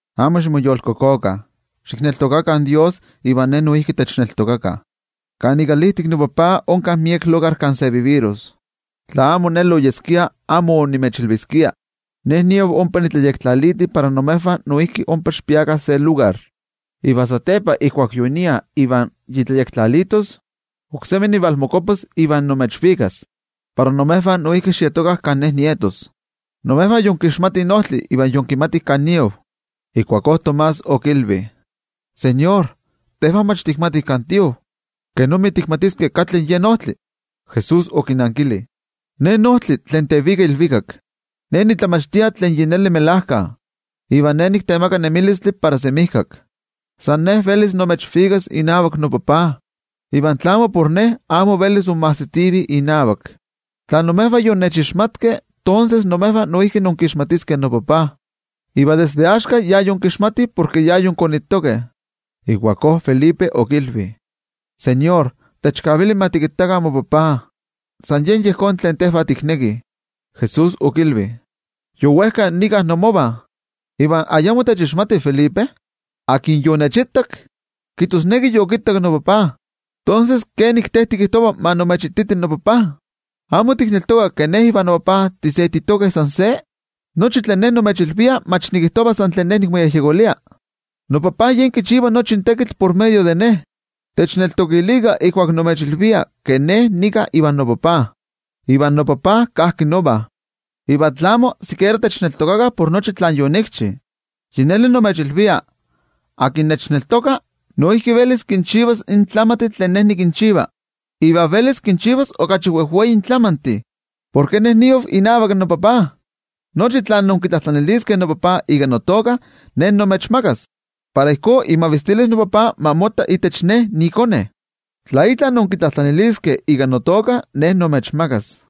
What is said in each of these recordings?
’Amo ximoyolkokokah. Xikneltokakah Dios iva Ne noijki techneltokakah. Kan ikalijtik noTajtzi onka miek lugar kan se chantis. Tla amo ijkó oyeskia, amo onimechilviskia. Ne niav ompa nitlayektlaliti para imejvah noijki ompa xikpiakah se lugar. Iva satepa ijkuak yonia iva yi tlayektlalitos, oksemi nivalmokuapas iva nimechvikas, para imejvah noijki xietokah kan Ne nietos. Imejvah yinkixmatih in ojtli iva yinkimatih kan niav. Ijkuakó Tomás okilvi: —NoTeko, tejvah mach tikmatih kan tiav, ¿kenomi tikmatiskeh katli yen ojtli? Jesús okinankili: —Ne niojtli tlen tevika ilvikak, Ne nitlamachtia tlen melajkayotl, iva Ne niktemaka nemilistli para semijkak. San Ne velis nimechvikas inavak noTajtzi, iva tla amo por Ne amo velis inmajsitivih inavak. Tla imejvah yonnechixmatkeh, tonses imejvah noijki inkixmatiskeh noTajtzi. Iva desde axka yinkixmatih, porke yinkonitokeh. Ijkuakó Felipe okilvi: —ToTeko, techkavili ma tikittakah moTajtzi. San yen yejón tlen tejvah tiknekih. Jesús okilvi: —Yowejka nika inmovah, ¿iva ayamo techixmati Felipe? Tlen yonechitak, kijtosneki yokittak noTajtzi. Tonses, ¿kenik in te tikijtova ma nimechititi in noTajtzi? ¿Amo tikneltoka ke Ne ivan noTajtzi timochijtokeh san se? Nochi tlen Ne nimechilvia, mach nikijtova san tlen Ne nikmoyejyekolia. NoTajtzi yen kichiva nochi in tekitl por medio de Ne. Techneltokilikah ijkuak nimechilvia ke Ne nika ivan noTajtzi, iva noTajtzi kajki nova. Iva tlamo, sikiera techneltokilikah por nochi tlen yonikchi. Yi neli nimechilvia, tlen nechneltoka, noijki velis kinchivas in tlamantih tlen Ne nikinchiva. Iva velis kinchivas okachi wejwei tlamantih, porke Ne niav inavak noTajtzi. Nochi tlen inkitlajtlaniliskeh noTajtzi ika notoka, Ne nimechmakas. Para ijkó imavistilis noTajtzi ma motta itech iKone. Tla itla inkitlajtlaniskeh ika notoka, Ne nimechmakas.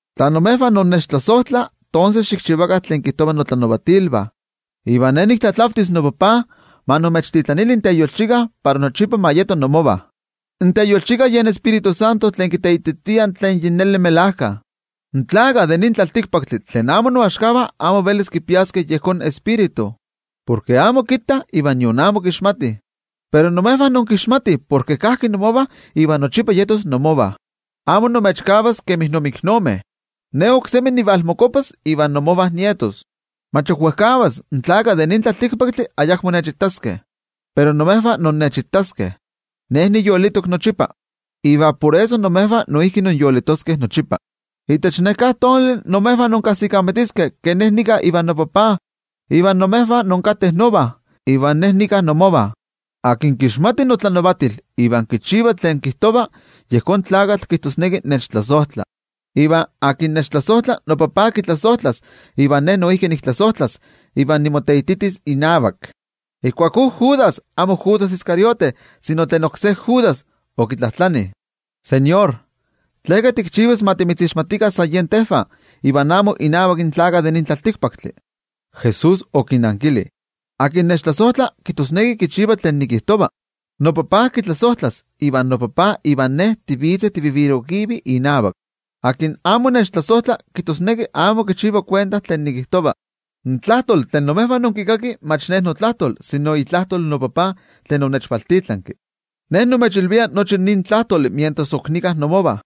’Tla imejvah innechtlasojtlah, tonses xikchivakah tlen kijtovah notlanavatilvah. Iva Ne niktlatlavtis noTajtzi ma imechtitlanili in Teyolchika para nochipa ma yeto inmovah. In Teyolchika yen Tioijyotzintli tlen kiteititia tlen yi neli melajka. In tlaltikpaktlakah tlen amo noaxkavah amo velis kipiaskeh yejón Tioijyotzintli, porke amo kittah iva nion amo kixmatih. Pero imejvah inkixmatih porke kajki inmovah iva nochipa yetos inmovah. Amo nimechkavas kemi inmiknomeh. Ne oksemi nivalmokuapas iva inmovah nietos. Mach ok wejkavas in tlaltikpaktlakah ayakmo nechitaskeh, pero imejvah innechitaskeh. Ne niyolitok nochipa, iva por eso imejvah noijki inyolitoskeh nochipa. Itech neká tonali imejvah inkajsikamatiskeh ke Ne nika ivan noTajtzi, iva imejvah inkateh nova, iva Ne nika inmovah. Tlen kinselia notlanavatilvah iva kinvelkaki, kiteititia nik yi neli nechtlasojtla. Iva tlen nechtlasojtla, noTajtzi kitlasojtlas, iva Ne noijki niktlasojtlas iva nimoteititis inavak. Ijkuakó Judas, amo Judas Iscariote sino tlen oksé Judas, okitlajtlani: —NoTeko, ¿tleka timoteixmatiltis tonavak iva amo innavak in tlaltikpaktlakah? Jesús okinankili: —Tlen nechtlasojtla kijtosneki kichiva tlen nikijtova. NoTajtzi kitlasojtlas, iva noTajtzi ivan Ne tivitzeh tichantikivih inavak. Akin amo nechtlasojtla, kijtosneki amo kichiva kuenta tlen nikijtova. In tlajtoli tlen imejvah inkikakih mach Ne notlajtol sino itlajtol noTajtzi tlen onechvaltitlanki. ’Ne nimechilvia nochi nin tlajtoli mientras ok nika inmovah.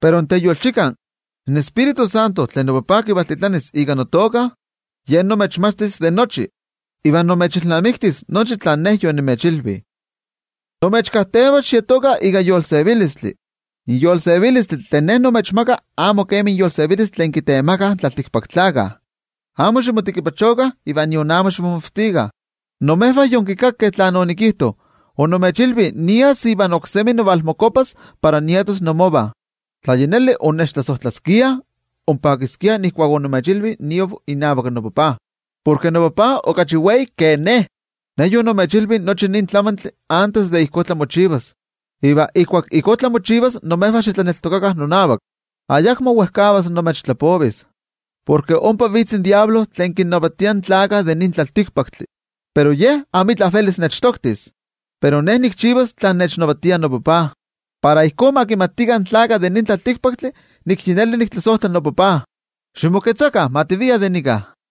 Pero in Teyolchika, in Tioijyotzintli tlen noTajtzi kivaltitlanis ika notoka, Ye imechmachtis de nochi, iva imechilnamiktis nochi tlen Ne yonimechilvi. ’Nimechkajteva xietokah ika yolsevilistli. In yolsevilistli tlen Ne nimechmaka amo kemi in yolsevilistli tlen kitemakah in tlaltikpaktlakah. Amo ximotekipachokah iva nion amo ximomavtikah. Imejvah yonkikakeh tlen onikijto, onimechilvi nias iva oksemi nivalmokuapas para nietos inmovah. Tla yi neli onnechtlasojtlaskiah, onpakiskiah ijkuak onimechilvi niav inavak noTajtzi, porke noTajtzi okachi wei ke Ne. Ne yonimechilvi nochi nin tlamantli antes de ijkó tlamochivalos, iva ijkuak ijkó tlamochivalos, imejvah xitlaneltokakah nonavak. ’Ayakmo wejkavas nimechtlapovis, porke ompa vitz in Amo Kuali Tlakatl tlen kinnavatia in tlaltikpaktlakah. Pero ye amitla velis nechtoktis. Pero Ne nikchivas tlen nechnavatia noTajtzi, para ijkó ma kimatikah in tlaltikpaktlakah nik yi neli niktlasojtla noTajtzi. Ximoketzakah, ma tiviah de nika.